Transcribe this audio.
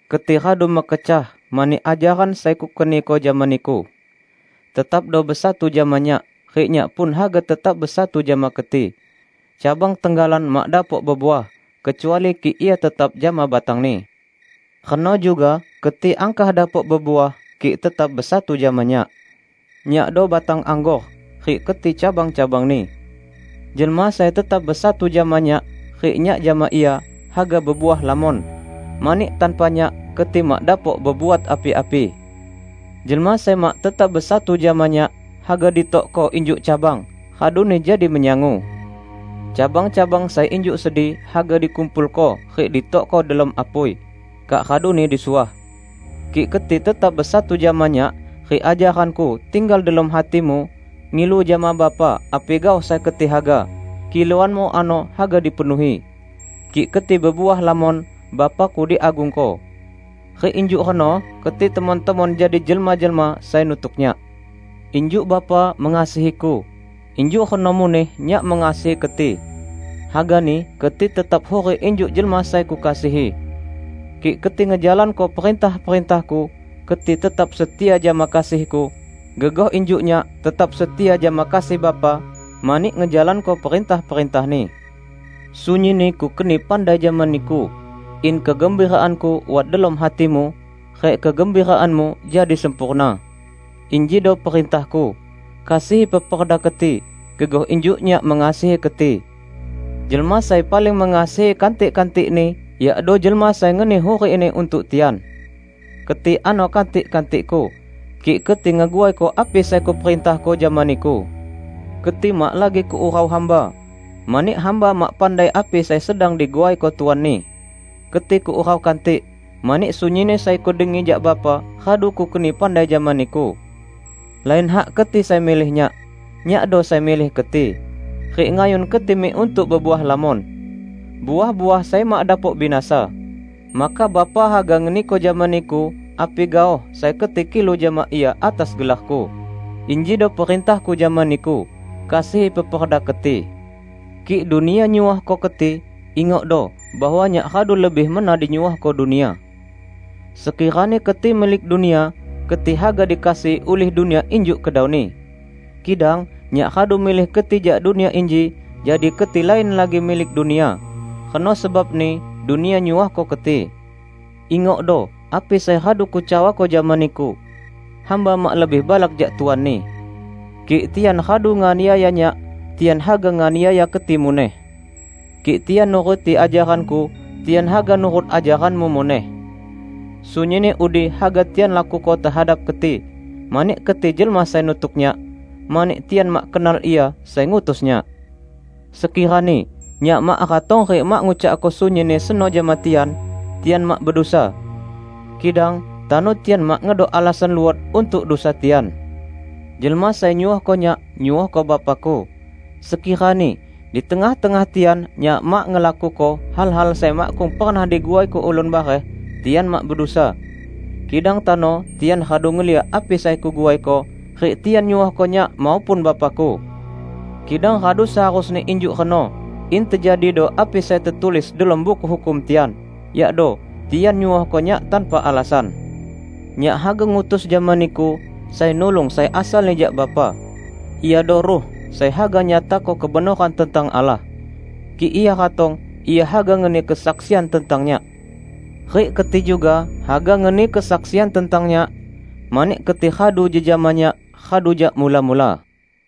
Keti radu mekecah mani ajaran sai Kukeniko jama niku. Tetapdo besatu jama Nyak rik Nyak pun haga tetap besatu jama keti. Cabang tenggalan mak dapok bebuah, kecuali kik ia tetap jama batangni. Reno juga keti angkah dapok bebuah, kik tetap besatu jama Nyak. Nyakdo batang anggor, rik keti cabang-cabangni. Jelma sai tetap besatu jama Nyak rik Nyak jama ia, haga bebuah lamon; mani tanpa Nyak, keti mak dapok bebuat api-api. Jelma sai mak tetap besatu jama Nyak, haga ditokko injuk cabang, raduni jadi menyangu. Cabang-cabang sai injuk sedi haga dikumpulko rik ditokko delom apui, kak raduni disuah. Kik keti tetap besatu jama Nyak rik ajaran-Ku tinggal delom hatimu, ngilu jama Bapa api gaoh sai keti haga; kiluanmu ano haga dipenuhi. Kik keti bebuah lamon, Bapa-Ku diagungko; rik injuk reno keti temon-temon jadi jelma-jelma sai nutuk Nyak. Injuk Bapa mengasihi-Ku, injuk reno muneh Nyak mengasihi keti. Hagani keti tetap hurik injuk jelma sai Kukasihi. Kik keti ngejalanko perintah-perintah-Ku, keti tetap setia jama kasih-Ku, gegoh injuk Nyak tetap setia jama kasih Bapa mani ngejalanko perintah-perintah-Ni. Sunyinni Kukeni pandai jama niku, in kegembiraan-Ku wat delom hatimu, rik kegembiraanmu jadi sempurna. Injido perintah-Ku: Kasihi peperda keti, gegoh injuk Nyak mengasihi keti. Jelma sai paling mengasihi kantik-kantikni yakdo jelma sai ngeni hurikni untuk tian. Keti ano kantik-kantik-Ku, kik keti ngeguaiko api sai Kuperintahko jama niku. Keti mak lagi Kuurau hamba, mani hamba mak pandai api sai sedang diguaiko tuanni. Keti Kuurau kantik, mani sunyinni sai Kudengi jak Bapa, radu Kukeni pandai jama niku. Lain hak keti sai milih Nyak. Nyakdo sai milih keti, rik ngayun keti mik untuk bebuah lamon -- uah-uah sai mak dapok binasa. Maka Bapa haga ngeniko jama niku api gaoh sai keti kilu jama Ia atas gelar-Ku. Injido perintah-Ku jama niku: Kasihi peperda keti." "Kik dunia nyuohko keti, ingokdo bahwa Nyak radu lebih mena dinyuohko dunia. Sekirani keti milik dunia, keti haga dikasihi ulih dunia injuk kedauni. Kidang Nyak radu milih keti jak dunia inji, jadi keti lain lagi milik dunia. Reno sebabni dunia nyuohko keti. Ingokdo api sai radu Kucawako jama niku, 'Hamba mak lebih balak jak tuanni.' Kik tian radu nganiaya Nyak, tian haga nganiaya keti muneh. Kik tian nuruti ajaran-Ku, tian haga nurut ajaranmu muneh. Sunyinni udi haga tian lakuko tehadap keti, mani keti jelma sai nutuk Nyak, mani tian mak kenal Ia sai ngutus Nyak. Sekirani Nyak mak ratong rik mak ngucakko sunyinni seno jama tian, tian mak bedusa. Kidang tano tian mak ngedok alasan luot untuk dusa tian. Jelma sai nyuohko Nyak, nyuohko Bapa-Ku. Sekirani di tengah-tengah tian Nyak mak ngelakuko hal-hal sai makkung pernah diguaiko ulun bareh, tian mak bedusa. Kidang tano tian radu ngeliak api sai Kuguaiko, rik tian nyuohko Nyak maupun Bapa-Ku. Kidang radu seharusni injuk reno, in tejadido api sai tetulis delom Buku Hukum tian, yakdo: 'Tian nyuohko Nyak tanpa alasan.' Nyak haga ngutus jama niku Sai Nulung sai asalni jak Bapa. Iado Ruh sai haga nyatako kebenoran tentang Allah. Kik Ia ratong, Ia haga ngeni kesaksian tentang Nyak. Rik keti juga haga ngeni kesaksian tentang Nyak, mani keti radu jejama Nyak radu jak mula-mula.